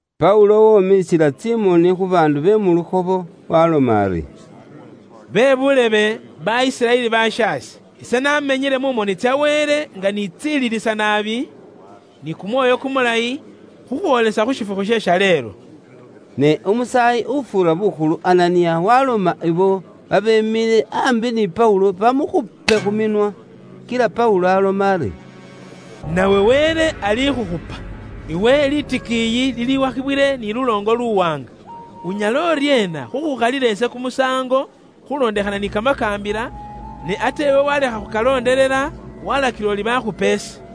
Paulo womiisila tsimoni khu baandu be mu lukhobo, waaloma ari, “Bebuulebe, ba Isiraeli bashaase, ise namenyile mu moni tsa Wele nga nitsililisa naabi, ni kumwoyo kumulayi, khukhwoolisa khu shifukhu she shaleelo.” Ne umusaayi ufuura bukhulu Ananiya waloma ibo abe babeemile aambi ni Paulo bamukhupe khu minwa. Kila Paulo aloma ari, “Nawe Wele alikhukhupa! Iwe litikiiyi liliwakhibwile ni luloongo luwaanga. Unyala uryeena khukhukhalila ise kumusaango khulondekhana ni kamakaambila, ne ate iwe walekha khukalondelela, walakila uri bakhupe ise?”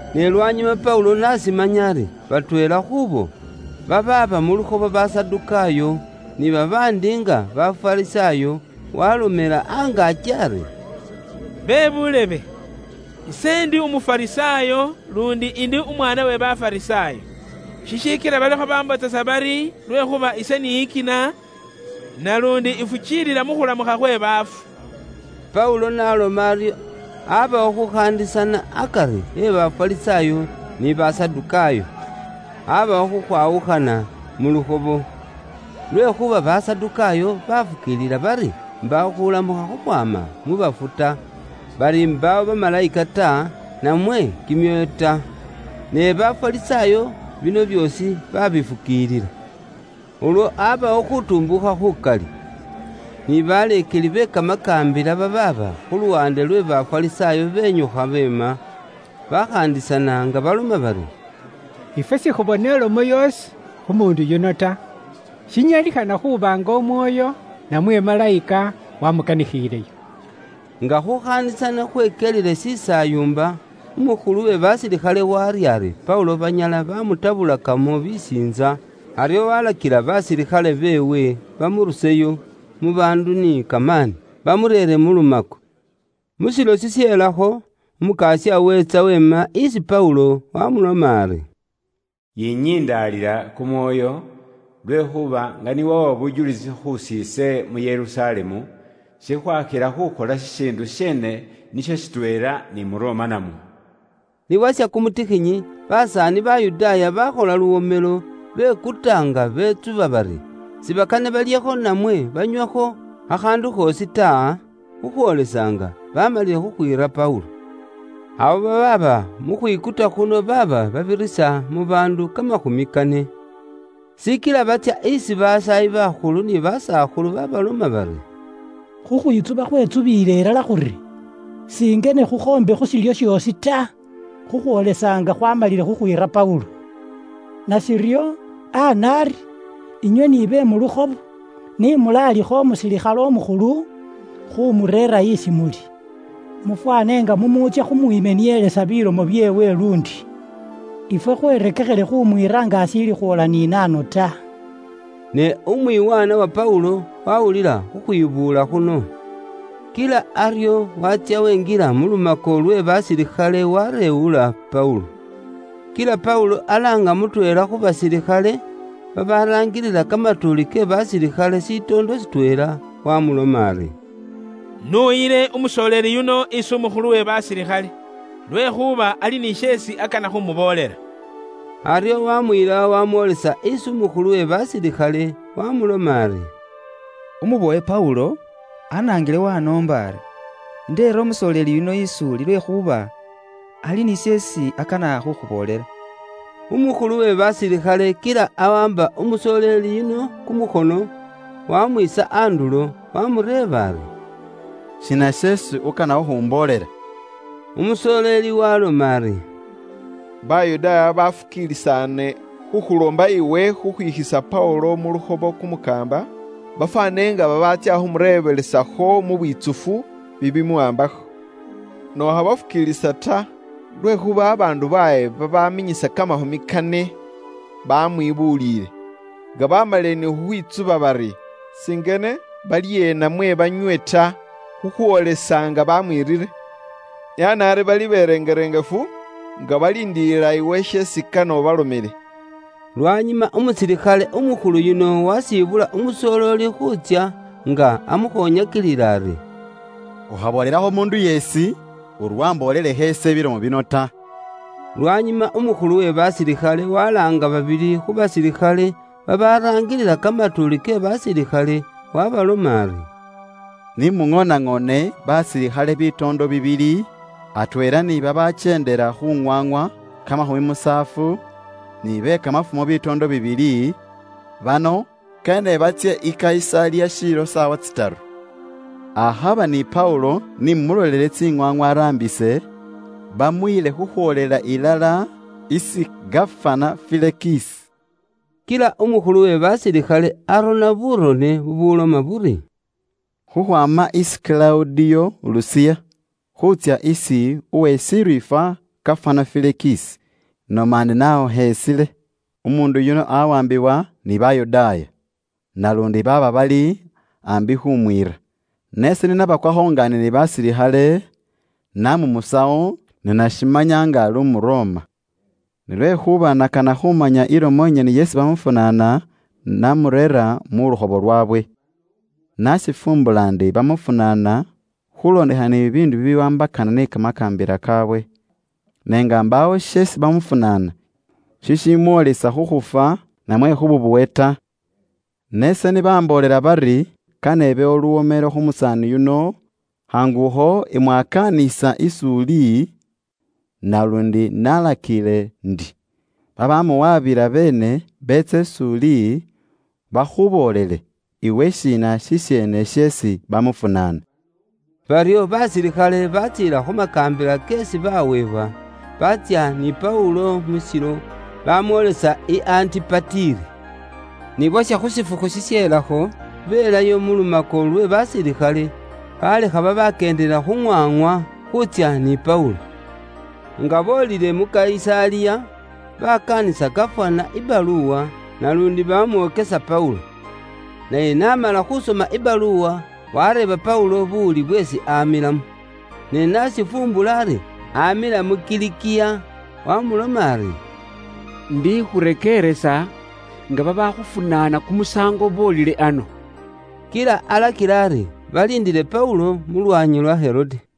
Ne lwanyuma Paulo n'ashimanya ari batweela khuubo babaaba mu lukhobo Basadukaayo, ni babaandi nga Bafarisaayo, waalomela angaaki ari, “Bebuulebe, ise indi Umufarisaayo, luundi indi umwaana we Bafarisaayo. Shishikila balikho bambotsesa bari lwekhuuba ise niyikina, naluundi ifukiilila mu khulamukha khwe baafu.” Paulo n'aloma aryo, abawo khukhaandisana akari e Bafarisaayo, ni Basadukaayo. Abawo khukhwawukhana mu lukhobo, lwekhuuba Basadukaayo bafukiilila bari mbaawo khulamukha khukhwaama mu baafu ta, bari mbaawo bamalayika ta, namwe kimyoyo ta. Ne Bafarisaayo bino byoosi babifukiilila. Ulwo abawo khutumbuukha khukali. Ni baleekeli be kamakaambila babaaba khu luwaande lwe Bafarisaayo benyukha beema, bakhaandisana nga baloma bari, “Ifwe sikhubona ilomo yoosi khu muundu yuno ta. Shinyalikhana khuuba nga mwoyo namwe malayika wamukanikhileyo.” Nga khukhaandisana khwekyelile shisaayumba, umukhulu we basilikhale warya ari Paulo banyala bamutabulakamo bisiintsa, aryo walakila basilikhale beewe bamuruseyo mu baandu ni kamaani, bamureere mu lumako. Mu shilo shishelakho, Umukasya weetsa weema isi Paulo, wamuloma ari, “Yinyindaalila kumwoyo, lwekhuuba nga niwawa bujulisi khusiise mu Yerusalemu, shikhwakhila khukhola shishiindu sheene nisho shitweela ni mu Roma namwo.” Ni bwasha kumutikhinyi, basaani Bayudaaya baakhola luwomelo, bekuta nga betsuba bari, sibakane balyekho namwe banywekho khakhaandu khoosi ta, khukhwoolesa nga bamalile khukhwiira Paulo. Abo babaaba mukhwikuta khuno baaba babirisa mu baandu kamakhumi kane. Shikila batsya isi basaayi bakhulu ni basakhulu babaloma bari, “Khukhwitsuba khwetsubiile ilala khuri singene khukhoombe khu shilyo shoosi ta, khukhwoolisa nga khwaamalile khukhwiira Paulo. Nashiryo, ana ari, inywe ni be mu lukhobo, ni mulaalikhe umusilikhale umukhulu khumureera isi muli, mufwane nga mumutsya khukhalawo kumusaango kweewe luundi. Ifwe khwerekekhile khumwiira nga ashiili khwoola ni nahano ta.” Ne umwiwaana wa Paulo wawulila khukhwibuula khuno. Kila aryo watsya wenjila mu lumako lwe basilikhale wareewula Paulo. Kila Paulo alaanga mutweela khu basilikhale, babaraangilila kamatuuli ke basilikhale shitoondo shitweela, wamuloma ari, “Nuyile umusoleeli yuno isi umukhulu we basilikhale, lwekhuuba ali ni sheesi akana khumuboolela.” Aryo wamuyila wamwolisa isi umukhulu we basilikhale, wamuloma ari, “Umubowe Paulo, anaangile wanoomba ari, indeere umusoleeli yuno is'uli, lwekhuuba ali ni sheesi akana khukhuboolela.” Umukhulu we basilikhale kila awaamba umusoleeli yuno kumukhono, wamwiisa andulo, waamureeba ari, “Shiina sheesi ukana khukhumboolela?” Umusooleli waaloma ari, “Bayudaaya bafukiilisaane khukhuloomba iwe khukhwikhisa Paulo mu lukhobo kumukaamba, bafwane nga babaatsya khumureebelesakho mu bwitsufu bibimuwaambakho. Ne ukhabafukiilisa ta, lwekhuuba babaandu baabwe babaminyisa kamakhumi kane bamwibuulile, nga bamalile ni khukhwitsuba bari, singene balye, namwe banywe ta, khukhwoolisa nga bamwiirire. Ne ana ari bali berengerengefu, nga baliindilila iwe sheesi kane ubalomele.” Lwanyuma umusilikhale umukhulu yuno wasibula umusoleeli khuutsya, nga amukhonyakilila ari, “Ukhaboolelakho umuundu yeesi, uri wamboolelekho ise bilomo bino ta.” Lwanyuma umukhulu we basilikhale walaanga babili khu basilikhale babaraangilila kamatuuli ke basilikhale, waabaloma ari, “Ni muŋoonaŋoone basilikhale bitoondo bibili, atweela ni babakyeendela khu ŋwaŋwa kamakhumi musaafu, ni be kamafumo bitoondo bibili; bano kane batsye i Kayisaliya shiilo saawa tsitaru. Akhaba ni Paulo ni mumulolele tsiŋwaaŋwa araambise, bamuyile khukhwoolela ilala isi gafana Felikisi.” Kila umukhulu we basilikhale arona burone bubuuloma buri: “Khukhwaama isi Kilawudiyo Lusiya, khuutsya isi uwe shiriifwa gafana Felikisi, inoma ndi naakhukheesile. Umuundu yuno aawaambibwa ni Bayudaaya, naluundi baaba bali aambi khuumwiira, ne ise ni nabakwakho nga ndi ni basilikhale, namumusawo ni nashimanya nga ali umu Roma. Ne lwekhuuba nakana khumanya ilomo inyene isi bamufunaana, namureera mu lukhobo lwaabwe. Nashifumbula ndi bamufunaana khulondekhana ni bibiindu bibiwaambakana ni kamakaambila kaawe, ne nga mbaawo sheesi bamufunaana shishimwolisa khu khufwa, namwe khu bubowe ta. Ne ise ni bamboolela bari kane ibewo luwomelo khu musaani yuno, khaangu akho imwakaanisa is'uli, naluundi nalakiile ndi babamuwabila beene beetse is'uli, bakhuboolele iwe shiina shisheene sheesi bamufunaana.” Baryo basilikhale batsiila khu makaambila keesi baweebwa, baatsya ni Paulo mu shilo, bamwoolisa i Antipatiri. Ni bwasha khu shifukhu shishelakho, belayo mu lumako lwe basilikhale, balekha babakyeendela khu ŋwaŋwa, khuutsya ni Paulo. Nga boolile mu Kayisaliya, bakaanisa gafana ibaluwa, naluundi bamwokesa Paulo. Naye n'amala khusoma ibaluwa, wareeba Paulo buwuli bweesi amilamo. Ne n'ashifumbula ari, amila mu Kilikiya, wamuloma ari, “Indikhurekeeresa nga babaakhufunaana kumusaango boolile ano.” Kila alakila ari baliindile Paulo mu lwaanyi lwa Herode.